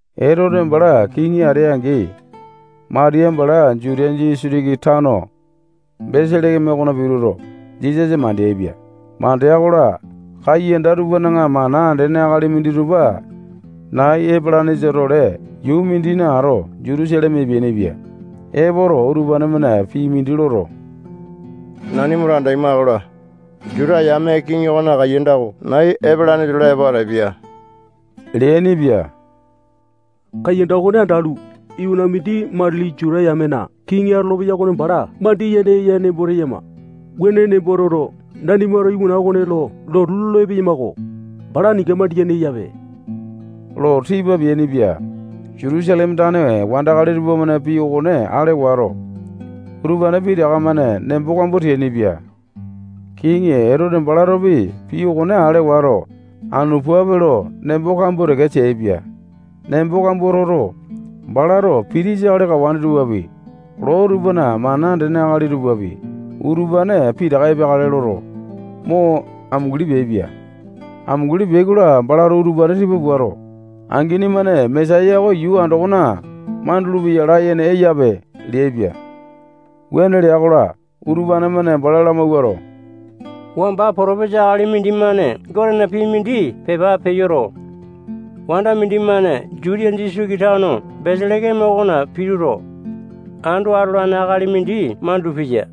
Etote bala kiŋi atea-angi, Matiya bala Jutiya disitiki tano Beselekeme okona pituto, Jisasa mandeaipia. Mandea-kola, kaiyanda tupana mana andene akali minditupa nai epelanesa-tole yuu mindina ato Jutusaleme epeainipia. Epoto, utupane-mane pii mindi loto, nanimato andaima-kola, Juta yame kiŋi okona kaiyanda oko nai epalanesa-tole epo atapia leainipia. Kaiyanda okone andalu, iwana mindi matili Juta yamena kiŋi atolopeya okone bala mandiyene eya nembo teyama. Wuane nembo toto, nanimato iwana okone lo lotu lolo epeyama-ko. Bala aninga mandiyene eyape lo tipa peainipia. Jutusaleme tane wandakali tupamane pii okone ale wato, utupane pitaka-mane nembo kambua teainipia. Kiŋi Etote balatopi pii okone ale wato, anu puape lo nembo kambua teke teaipia. Nembo kambua toto, balato pitisa akali kawane tupapi, loo tupana mana andene akali tupapi, utupane pitaka epeakale loto, mo amunguli peaipia. Amunguli peai-kola, balato utupane tipa puato, angini-mane Mesaya oko yuu andokona mandulu-peya layene eyape leaipia. Wuane lea-kola, utupane-mane bala lamawuato, wamba potopesa akali mindimane Gotena pii mindi pepa peyoto, wanda mindimane Jutiya disitiki tano Beselekeme okona pituto, ando atolane akali mindi mandulu-peya.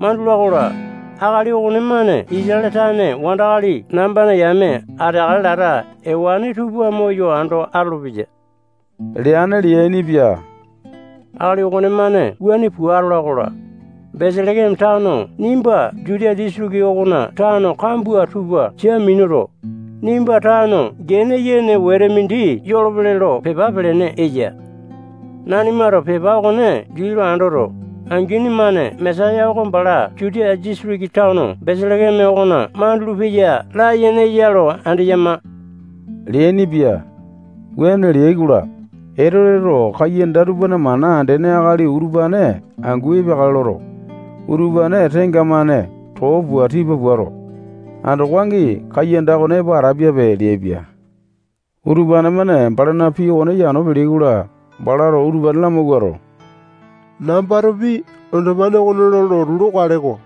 Mandula-kola, akali okonemane Isatale tane wandakali nambana yame ateakale lata ewane tupa moyo ando atolopeya leane leainipia. Akali okonemane wuane pua atala-kola, Beselekeme tano nimba Jutiya disitiki okona tano kambua tupa sia minuto, nimba tano gene yene wete mindi yolopele lo pepa pelene eya. Nanimato pepa okone dii lo andoto, angini-mane Mesaya oko bala Jutiya disitiki tano Beselekeme okona mandulu-peya layene eya lo andeyama leainipia. Wuane leai-kola, Etoteto kaiyanda tupana mana andene akali utupane angu epeakale loto, utupane tenga-mane too pua tipa puato, andoko angi kaiyanda okone epo atapiape leaipia. Utupane-mane balana pii okone yano peleai-kola, balato utupane lamawuato, nambatopi andopane okone lo lotu lokale-ko.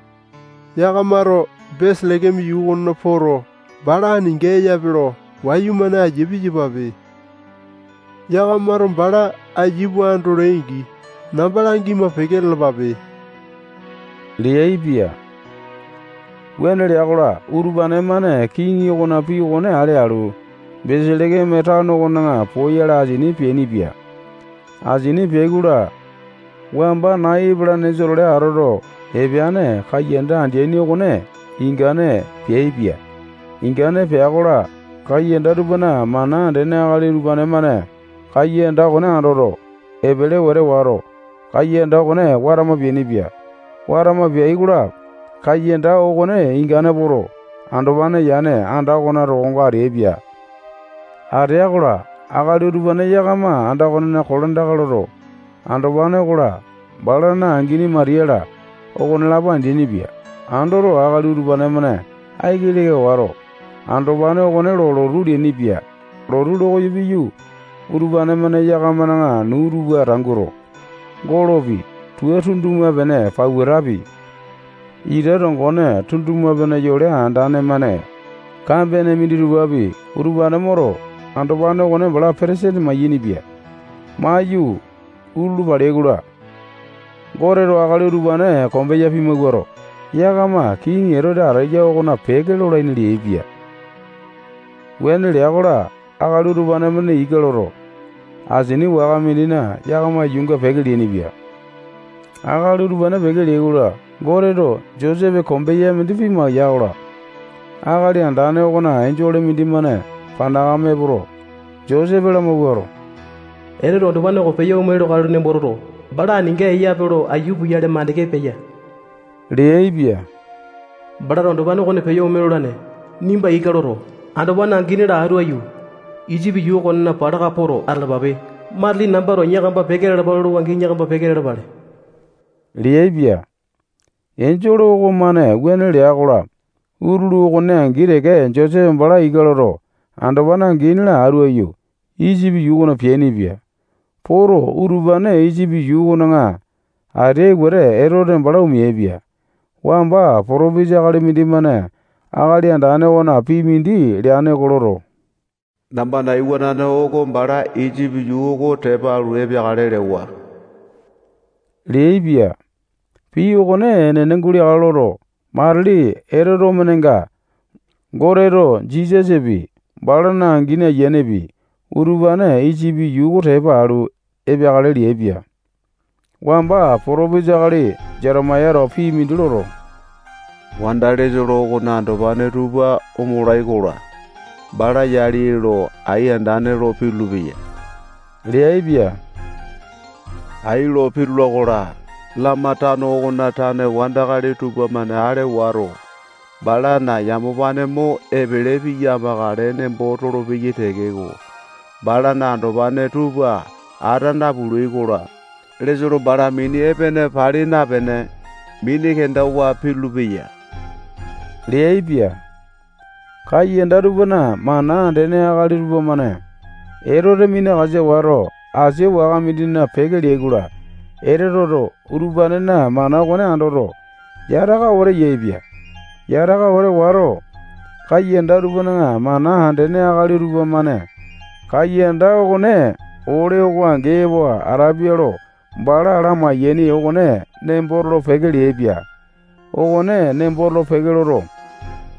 Yakamato Beselekeme yuu okona poto, bala aninga eyape lo wayumane aiya piyapape. Yakamato bala aiya pua andolai-angi, namba langima peke lalapape leaipia. Wuane lea-kola, utupane-mane kiŋi okona pii okone ale alu, Beselekeme tano okona poyale asini peainipia. Asini peai-kola, wamba nai epalanesa-tole atoto epeane kaiyanda andeaini okone ingane peaipia. Ingane pea-kola, kaiyanda tupana mana andene akali utupane-mane kaiyanda okone andoto, epele wete wato, kaiyanda okone watama peainipia. Watama peai-kola, kaiyanda okone ingane poto, andopane yane anda okona tokonga ateaipia. Atea-kola, akali utupane yakama anda okonena kolandaka loto, andopane okola, balana angini Matiya-la, okonelapo andeaini-pia. Andoto, akali utupane-mane aiki leka wato, andopane okone lo lotu leainipia. Lotu lo koyo piyu, utupane-mane yakamana nuu tupa tanguto, golopi, tua tunduma-pene pautapi, ita tongone tunduma-pene yole andane-mane kambene minditupapi, utupane moto, andopane okone bala petesene mayainipia. Maiyu, utulu paleai-kola, Goteto akali utupane kombeya pimawuato, yakama kiŋi Etote ateya okona peke lolaini leaipia. Wuane lea-kola, akali utupane-mane ika loto, asini waka mindina yakama yuunga peke leainipia. Akali utupane peke leai-kola, Goteto Josepe kombeya mindi pimaya-kola, Akali Andane okona enjole mindimane panakame epoto, Josepe lamawuato, Etoteto andopane oko peyo ome lokale nembo toto, bala aninga eyape lo aiya puyale mandeke peya leaipia. Balato andopane okone peyo ome lolane. Nimba ika loto, andopane angini-la atu aiyu, Isipi yuu okona palaka poto atalapape. Matili nambato yakama peke lalapa lolowa-angi, yakama peke lalapale leaipia. Enjole okomane wuane lea-kola, utulu okone angi teke Josepe bala ika loto, andopane angini-la atu aiyu, Isipi yuu okona peainipia. Poto, utupane Isipi yuu okona ateai wete, Etote bala omeaipia. Wamba potopesa akali mindimane Akali Andane okona pii mindi leane oko loto, nambana iwanane oko bala Isipi yuu oko tepa alu, epeakale lewa leaipia. Pii okone enene guleakale loto, matili Etote omenenga, Goteto Jisasapi, balana angini ayianepi, utupane Isipi yuu oko tepa alu epeakale leaipia. Wamba potopesa akali Jetemayato pii mindi loto, wanda Lesolo okona andopane tupa omolai-kola, bala yali ee lo ai andane lo pitulu-peya leaipia. Ai lo pitula-kola, Lama tano okona tane wandakali tupamane ale wato, balana yamapane mo epele piya amakale nembo tolopeyai tekeko, balana andopane tupa ata napulai-kola, Lesolo bala mini epene pali napene, mini kendawa pitulu-peya leaipia. Kaiyanda tupana mana andene akali tupamane Etote minakasa wato, asia waka mindina peke leai-kola, Etoteto utupanena mana okone andoto, yataka wete yaepia. Yataka wete wato, kaiyanda tupana mana andene akali tupamane kaiyanda okone ole oko angi epo atapia lo bala lamai-yaini okone nembo tolo-peke leaipia. Okone nembo tolo-peke loto,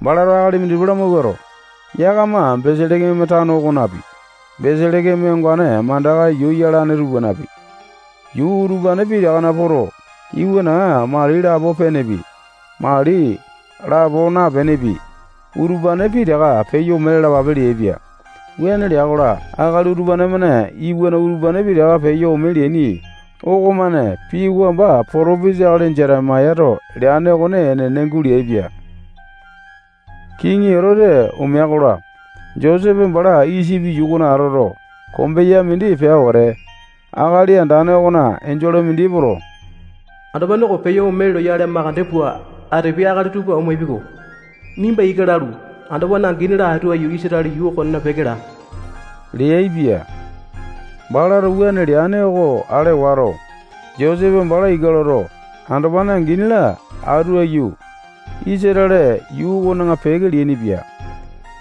balato akali minditupa lamawuato, yakama Beselekeme tano okonapi, Beselekeme ongane mandaka yuu yalane tupanapi, yuu utupane pitakana poto, iwanaŋa mali lapo penepi, mali lapo napenepi, utupane pitaka peyo ome lalapape leaipia. Wuane lea-kola, akali utupane-mane iwana utupane pitaka peyo ome leaini okomane pii wamba potopesa akali Jetemayato leane okone enene guleaipia. Kiŋi Etote omea-kola, Josepe bala Isipi yuu okona atoto, kombeya mindi pea wete, Akali Andane okona enjole mindi epoto, andopane oko peyo ome loyale makande pua atapiai akali tupa omapiai-ko. Nimba ika lalu, andopane angini-la atu aiyu, Isatale yuu okona peke laa leaipia. Balato wuane leane oko ale wato, Josepe bala ika loto, andopane angini-la atu aiyu, Isatale yuu okona peke leainipia.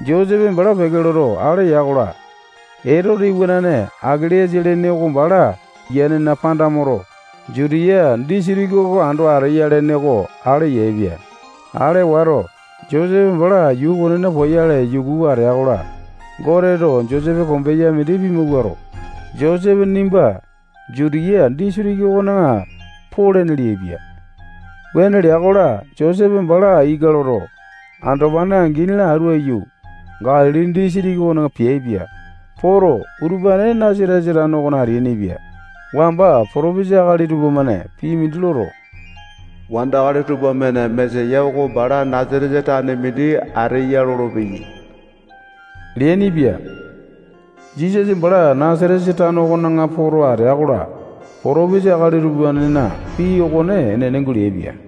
Josepe bala peke loto, ale ya-kola, Etote iwanane Akele-yasa lene oko bala ayianena panda moto, Jutiya disitiki oko ando ateya lene oko ale yaepia. Ale wato, Josepe bala yuu okonena poyale yukuwa atea-kola, Goteto Josepe kombeya mindi pimawuato, Josepe nimba Jutiya disitiki okona polene leaipia. Wuane lea-kola, Josepe bala ika loto, andopane angini-la atu aiyu, Galili disitiki okona peaipia. Poto, utupane Nasatesa tano okona ateainipia. Wamba potopesa akali tupamane pii mindi loto, wandakali tupamane Mesaya oko bala Nasatesa tane mindi ateya lolopeyai leainipia. Jisasa bala Nasatesa tano okona poto atea-kola, potopesa akali utupanena pii okone enene guleaipia.